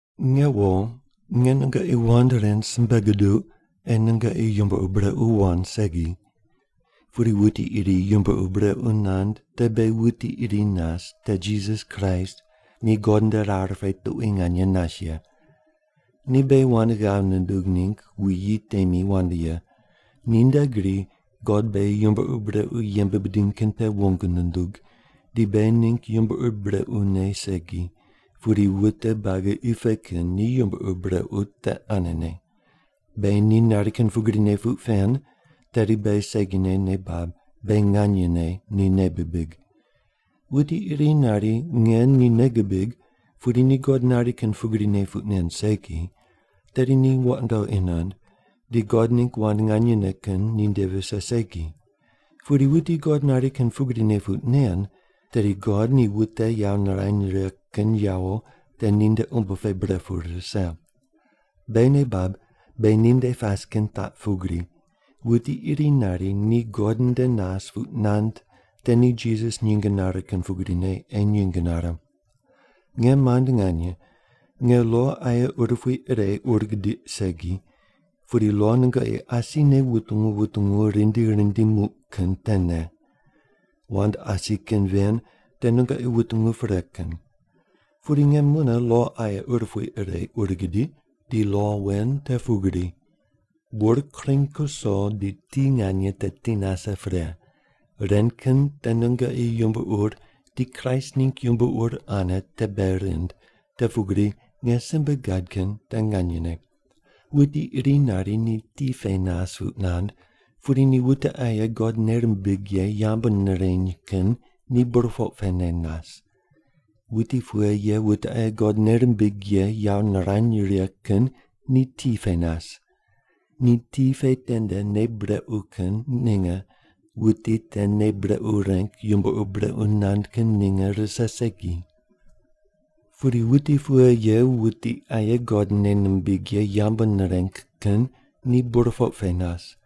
Nge wo, nge nungoqi wand ren simbe guduq, ei nungoqi yumbo ur brequ wand segi. Pudi wuti iri yumbo ur brequ nand, te beghi wuti iri nas, te Jisas Kraist, ni God nde rar pe tuqui nganye nas ye. Ni beghi wand ghav nundug ningg wuyi temi wand ye. Ninde gri God beghi yumbo ur brequ yembe bidiny kin te wong nundug, di beghi ningg yumbo ur brequne segi, pudi wute buagi qi pe kin ni yumbo ur brequ te anene. Beghi ni nari kin pugrine puq pen, tedi beghi segine nei bab beghi nganyene ni nei bibig. Wuti iri nari, “Nge ni nei gibig” pudi ni God nari kin pugrine puq nen segi, tedi ni wandoqi nand di God ningg wand nganyene kin ninde vise segi. Pudi wuti God nari kin pugrine puq nen, tedi God ni wute yawo nirany righe kin yawo te ninde umbo pe bre pu rise. Beghi nei bab beghi ninde pas kin taq pugri: Wuti iri nari ni God nde nas puq nand te ni Jisas nyinge nare kin pugrine ei nyinge nare. Nge mand nganye, nge lo aye urupui ire ur gidiq segi, pudi lo nungoqi asine wutungu wutungu rindi rindi muq kin tene. Wand asi kin ven te nungoqi wutungu pre kin. Pudi nge mune lo aye urupui ire ur gidiq, di lo wen te pugri: bur kring kuso, di ti nganye te ti nase pre. Ren kin te nungoqi yumbo ur di Kraist ningg yumbo ur ane te bei rind, te pugri nge simbe gad kin te nganyene. Wuti iri nari ni ti pe nas puq nand, pudi ni wute aye God nei rimbig ye yambu nireny kin ni burpoq pene nas. Wuti pughe ye wute aye God nei rimbig ye yawo nirany righe kin ni ti pe nas. Di ti pe tende nei brequ kin ninge wuti te nei brequ reng yumbo ur brequ nand kin ninge rise segi. Pudi wuti pughe ye wuti aye God nei nimbig ye yambu nireng kin ni burpoq pe nas,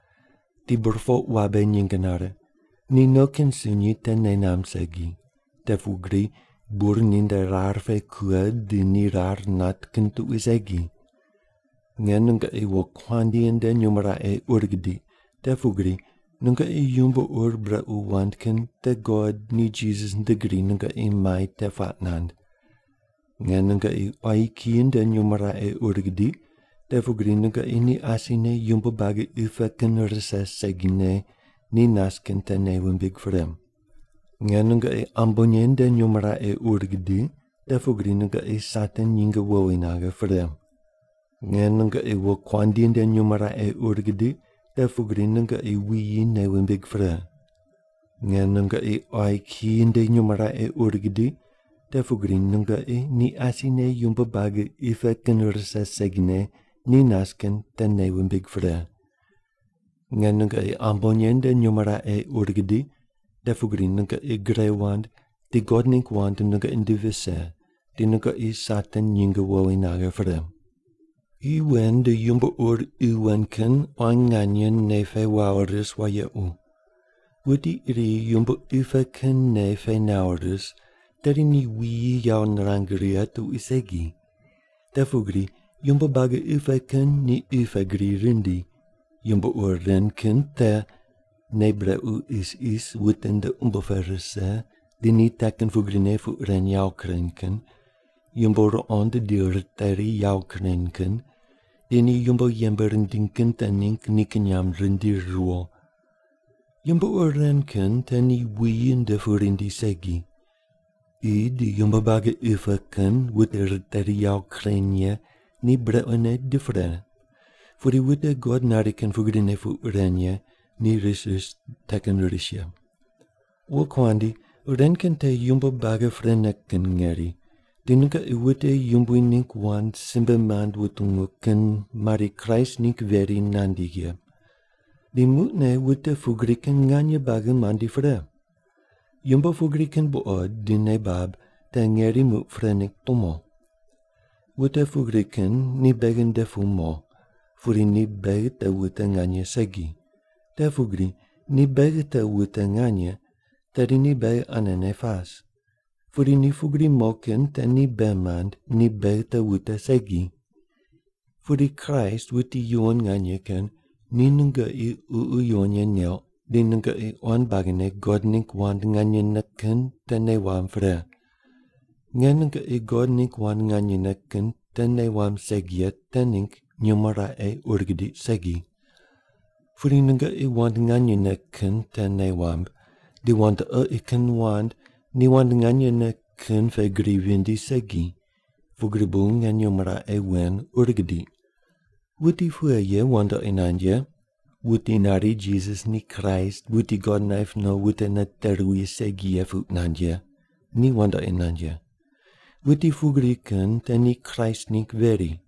di burpoq wabe nyinge nare, ni no kin sunyi te nei namb segi, te pugri bur ninde rar pe kughe di ni rar nat kin tuqui segi. Nge nungoqi wokuandi nde nyumo raqe ur gidiq, te pugri nungoqi yumbo ur brequ wand kin te God ni Jisas nde gri nungoqi mai te puaq nand. Nge nungoqi quayi kiyi nde nyumo raqe ur gidiq, te pugri nungoqi ni asine yumbo buagi qi pe kin rise segine ni nas kin te nei wumbig pre. Nge nungoqi ambonye nde nyumo raqe ur gidiq, te pugri nungoqi Satan nyinge wowi naghe pre. Nge nungoqi wokuandi nde nyumo raqe ur gidiq, te pugri nungoqi wuyi nei wumbig pre. Nge nungoqi quayi kiyi nde nyumo raqe ur gidiq, te pugri nungoqi ni asine yumbo buagi qi pe kin rise segine ni nas kin te nei wumbig pre. Nge nungoqi ambonye nde nyumo raqe ur gidiq, te pugri nungoqi gre wand, di God ningg wand nungoqi nde vise, di nungoqi Satan nyinge wowi naghe pre. Qi wen di yumbo ur qi wen kin quan nganye nei pe wawo ris wayequ. Wuti iri yumbo qi pe kin nei pe nawo ris, tedi ni wuyi yawo nirang righe tuqui segi. Te pugri yumbo buagi qi pe kin ni qi pe gri rindi. Yumbo ur ren kin te: Nei brequ isis wute nde umbo pe rise di ni te kin pugrine puq ren yawo kureny kin, yumbo ruqond di riteri yawo kureny kin, di ni yumbo yembe rindiny kin te ningg nikin nyamb rindiri riwo. Yumbo ur ren kin te ni wuyi nde pu rindi segi. Qi di yumbo buagi qi pe kin wute riteri yawo kureny ye ni brequne di pre, pudi wute God nari kin pugrine puq ren ye ni ris ris te kin ris ye. Wokuandi, ren kin te yumbo buagi prene kin ngeri, di nungoqi wute Yumbui ningg wand simbe mand wutungu kin mari Kraist ningg veri nandi ye. Di muqne wute pugri kin nganye buagi mandi pre. Yumbo pugri kin buqod di nei bab te ngeri muq pre ningg tumo. Wute pugri kin ni beghi nde pu mo, pudi ni beghi te wute nganye segi. Te pugri ni beghi te wute nganye, tedi ni beghi anene pas. Pudi ni pugri mo kin te ni bei mand, ni beghi te wute segi. Pudi Kraist, wuti yuwon nganye kin, ni nungoqi Ququ Yuwon Ye neuq, di nungoqi quan buagine God ningg wand nganyene kin te nei wamb pre. Nge nungoqi God ningg wand nganyene kin te nei wamb segi ye te ningg nyumo raqe ur gidiq segi. Pudi nungoqi wand nganyene kin te nei wamb, di wandoqi kin wand ni wand nganyene kin pe gri vindi segi, pugri bu nge nyumo raqe wen ur gidiq. Wuti pughe ye wandoqi nand ye? Wuti nari Jisas ni Kraist, wuti God naip no wute nate ruwi, segi ye puq nand ye, ni wandoqi nand ye. Wuti pugri kin te ni Kraist ningg veri.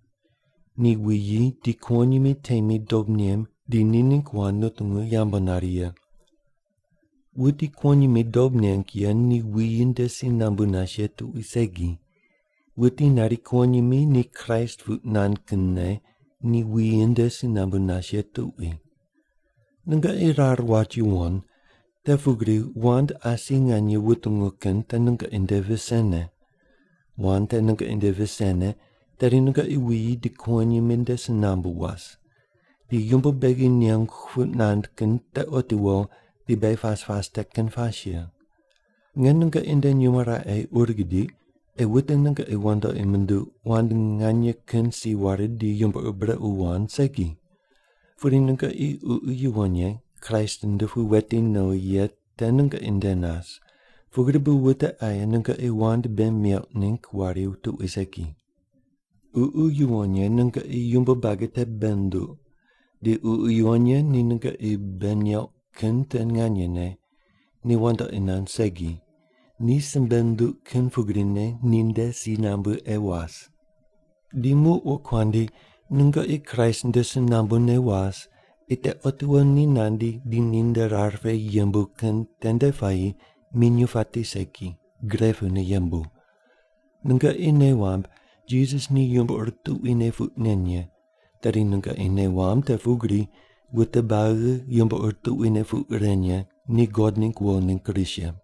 Ni wuyi di kuwonyimi temi dob nem di ni ningg wand nutungu yambu nari ye. Wuti kuwonyimi dob neng ye ni wuyi nde si nambu nas ye tuqui segi. Wuti nari kuwonyimi ni Kraist puq nand kinne ni wuyi nde si nambu nas ye tuqui. Nungoqi rar wat yuwon, te pugri wand asi nganye wutungu kin te nungoqi nde visene. Wand te nungoqi nde visene, tedi nungoqi wuyi di kuwonyimi nde si nambu was. Di yumbo beghi nengu puq nand kin te otiwo di beghi pas pas te kin pas ye. Nge nungoqi nde nyumo raqe ur gidiq ei wute nungoqi wandoqi munduq wand nganye kin si ware di yumbo ur brequ wand segi. Pudi nungoqi Ququ Yuwon Ye Kraist nde pu weti nowi ye te nungoqi nde nas, pugri bu wute aye nungoqi wand bei meuq ningg wari tuqui segi. Ququ Yuwon Ye nungoqi yumbo buagi te bei nunduq, di Ququ Yuwon Ye ni nungoqi bei neuq kin te nganyene, ni wandoqi nand segi. Ni simbe nunduq kin pugrine ninde si nambu ei was. Di muq wokuandi, nungoqi Kraist nde si nambune was, ei te otiwo ni nandi di ninde rar pe yembu kin tende puayi minyuw pati segi, gre pune yembu. Nungoqi nei wamb Jisas ni yumbo ur tuquine puq nen ye, tedi nungoqi nei wamb te pugri wute buagi yumbo ur tuquine puq ren ye ni God ningg wo ningg ris ye.